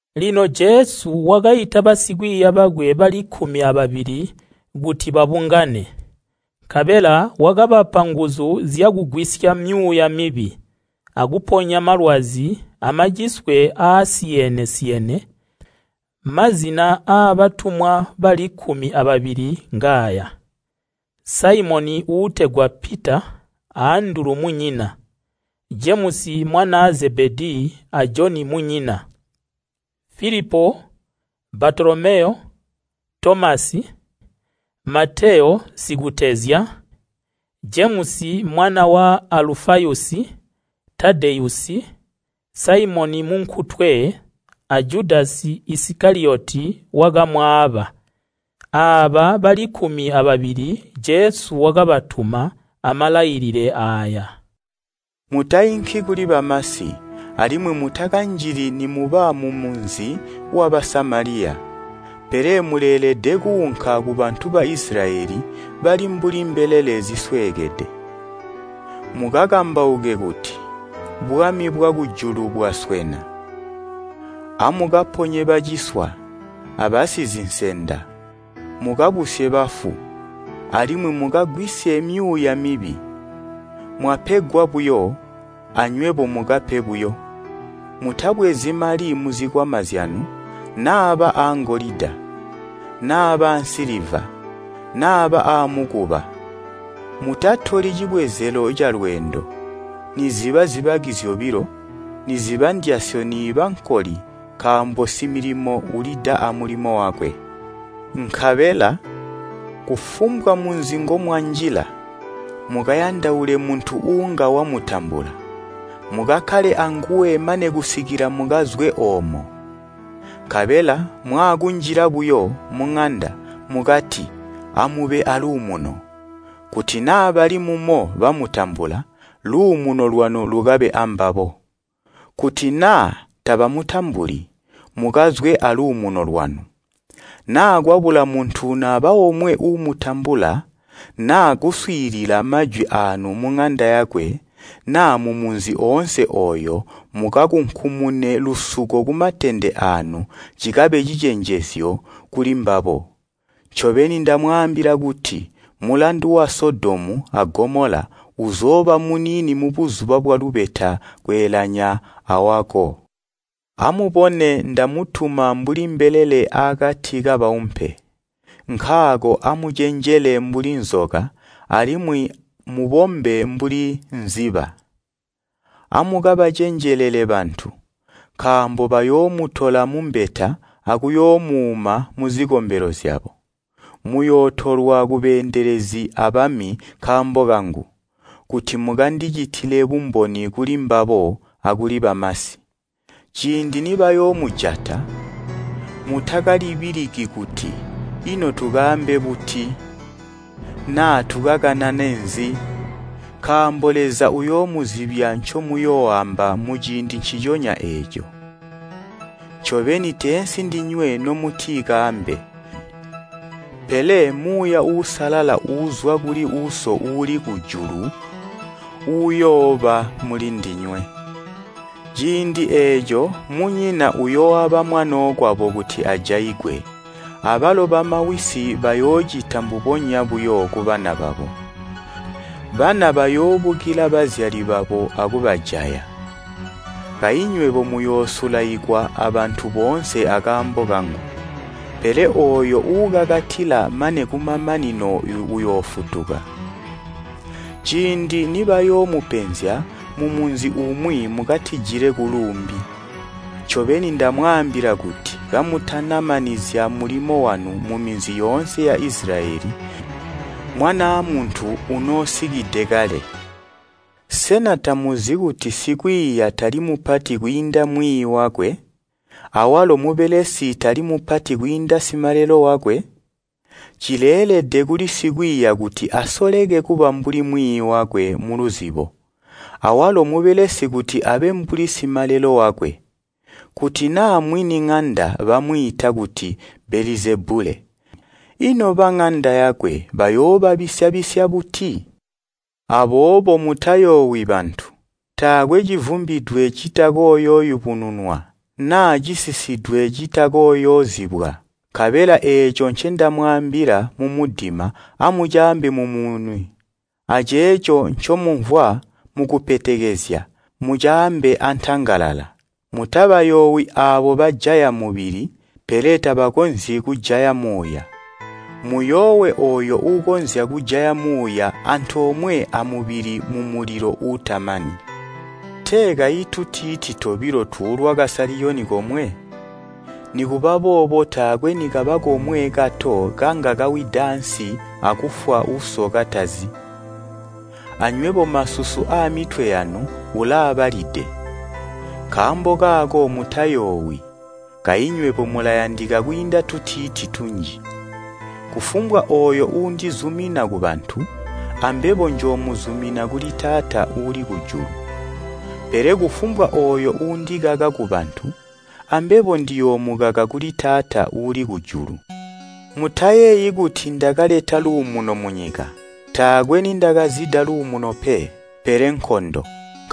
Lino Jesu wakaita basikwiiya bakwe bali kkumi ababili kuti babungane. Nkabela wakabapa nguzu zyakugwisya myuuya mibi, akuponya malwazi amaciswe aasiyene-siyene. Mazina aabo ngaaya: Saimoni uutegwa Pita a Andulu munyina, Jemusi mwanaa Zebedii a Joni munyina, Filipo, Baatolomeyo, Tomasi, Mateyo sikutezya, Jemusi mwana wa Alufayusi, Tadeyusi, Saimoni munkutwe a Judasi Isikaliyoti wakamwaaba. Aaba bali kkumi ababili Jesu wakabatuma, amalailile aaya: “Mutainki kuli bamasi, alimwi mutakanjili nimuba mumunzi wa Basamaliya. Pele muleelede kuunka kubantu ba Isilayeli bali mbuli mbelele zisweekede. Mukakambauke kuti, ‘Bwami bwakujulu bwaswena.’ Amukaponye baciswa, abasizinsenda, mukabusye bafu, alimwi mukagwisye myuuya mibi. Mwapegwa buyo, anywebo mukape buyo. Mutabwezi mali muzikwama zyanu naaba aangolida, naaba ansiliva, naaba aamukuba. Mutatoli cibwezelo calweendo, niziba zibaki zyobilo, niziba ndyasyo niiba nkoli nkaambo similimo ulida amulimo wakwe. “Nkabela kufumbwa munzi ngomwanjila, mukayandaule muntu uunga wamutambula. Mukakkale anguwe mane kusikila mukazwe oomo. Nkabela mwaakunjila buyo muŋanda, mukati ‘Amube aaluumuno.’ Kuti naa bali mumo bamutambula, luumuno lwanu lukabe ambabo. Kuti naa tabamutambuli, mukazwe aluumuno lwanu. Naa kwabula muntu naba omwe uumutambula naa kuswiilila majwi aanu muŋanda yakwe naa mumunzi oonse ooyo mukakunkumune lusuko kumatende aanu cikabe cicenjezyo kulimbabo. Jesu wakati, ncobeni ndamwaambila kuti mulandu wa Sodomu a Gomola uzooba muniini mubuzuba bwalubeta kweelanya awako. “Amubone ndamutuma mbuli mbelele aakati kabaumpe, nkaako amucenjele mbuli nzoka alimwi mubombe mbuli nkwilimba. Amukabacenjelele bantu, nkaambo bayoomutola mumbeta akuyoomuuma muzikombelo zyabo. Muyootolwa kubeendelezi abami nkaambo kangu, kuti mukandicitile bumboni kulimbabo akuli bamasi. Ciindi nibayoomujata, mutakalibiliki kuti ‘Ino tukaambe buti?’ naa ‘Tukakanane nzi?’ nkaambo Leza uyoomuzibya ncomuyooamba muciindi nciconya eeco. Ncobeni teensi ndinywe nomuti kaambe, pele Muuya Uusalala uuzwa kuli Uso uuli kujulu uyooba mulindinywe. “Ciindi eeco munyina uyooaba mwanookwabo kuti ajaigwe, abalo bamawisi bayoocita mbubonya buyo kubana babo, bana bayoobukila bazyali babo akubajaya. Kayi nywebo muyoosulaikwa abantu boonse akaambo kangu. Pele ooyo uukakatila mane kumamanino uyoofutuka. Ciindi nibayoomupenzya mumunzi umwi mukatijile kuluumbi. Ncobeni ndamwaambila kuti kamutana manizya mulimo wanu muminzi yoonse ya Isilayeli Mwanaa Muntu unoosikide kale. “Sena tamuzi kuti sikwiiya tali mupati kwiinda Mwiiyi wakwe, awalo mubelesi tali mupati kwiinda simalelo wakwe? Cileelede kuli sikwiiya kuti asoleke kuba mbuli Mwiiyi wakwe muluzibo, awalo mubelesi kuti abe mbuli simalelo wakwe. Kuti naa mwini ŋanda bamwiita kuti Belezebule, ino baŋanda yakwe bayoobabisya-bisya buti? “Aboobo mutayoowi bantu. Taakwe civumbidwe citakooyooyubununwa, naa cisisidwe citakooyoozibwa. Nkabela eeco ncendamwaambila mumudima amucaambe mumumuni aceeco ncomumvwa mukupetekezya mucaambe antangalala. Mutabayoowi aabo bajaya mubili pele tabakonzyi kujaya muuya. Muyoowe ooyo uukonzya kujaya muuya antoomwe amubili mumulilo uutamani. Tee kayi tutiiti tobilo tuulwa kali komwe? Nikubaboobo taakwe nikaba komwe kato kanga kawida ansi akufwa Uso katazi. Anywebo masusu aamitwe yanu ulaabalide. Nkaambo kaako mutayoowi, kayi nywebo mulayandika kwiinda tutiiti tunji. “Kufumbwa ooyo uundizumina kubantu, ambebo njoomuzumina kuli Taata uuli kujulu. Pele kufumbwa ooyo uundikaka kubantu ambebo ndiyoomukaka kuli Taata uuli kujulu. “Mutayeeyi kuti ndakaleta luumuno munyika. Taakwe nindakazida luumuno pe, pele nkondo.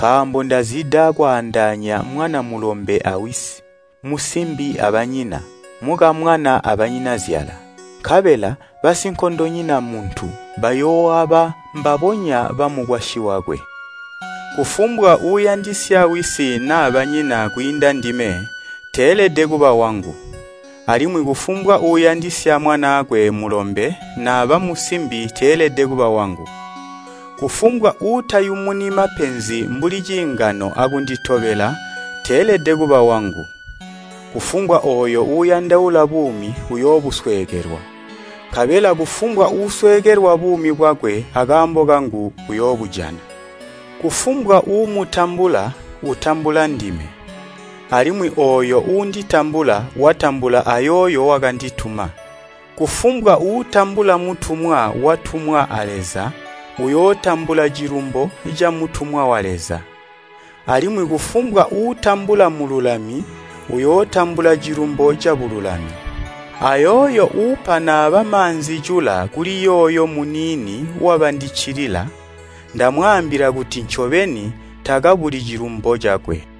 Nkaambo ndazida kwandaanya mwana mulombe awisi, musimbi abanyina, mukamwana abanyinazyala. Nkabela basinkondonyina muntu, bayooaba mbabonya bamukwasyi wakwe. “Kufumbwa uuyandisya wisi naa banyina kwiinda ndime teelede kuba wangu. Alimwi kufumbwa uuyandisya mwanaakwe mulombe naba musimbi teelede kuba wangu. Kufumbwa uutayumuni mapenzi mbuli ciingano akunditobela teelede kuba wangu. Kufumbwa ooyo uuyandaula buumi uyoobusweekelwa, nkabela kufumbwa uusweekelwa buumi bwakwe akaambo kangu uyoobujana. “Kufumbwa uumutambula utambula ndime, alimwi ooyo uunditambula watambula ayooyo wakandituma. Kufumbwa uutambula mutumwa watumwa a Leza uyootambula cilumbo camutumwa wa Leza. Alimwi kufumbwa uutambula mululami uyootambula cilumbo cabululami. Ayooyo uupa naaba maanzi-cula kuli yooyo muniini wabandiccilila, ndamwaambila kuti ncobeni, takabuli cilumbo cakwe.”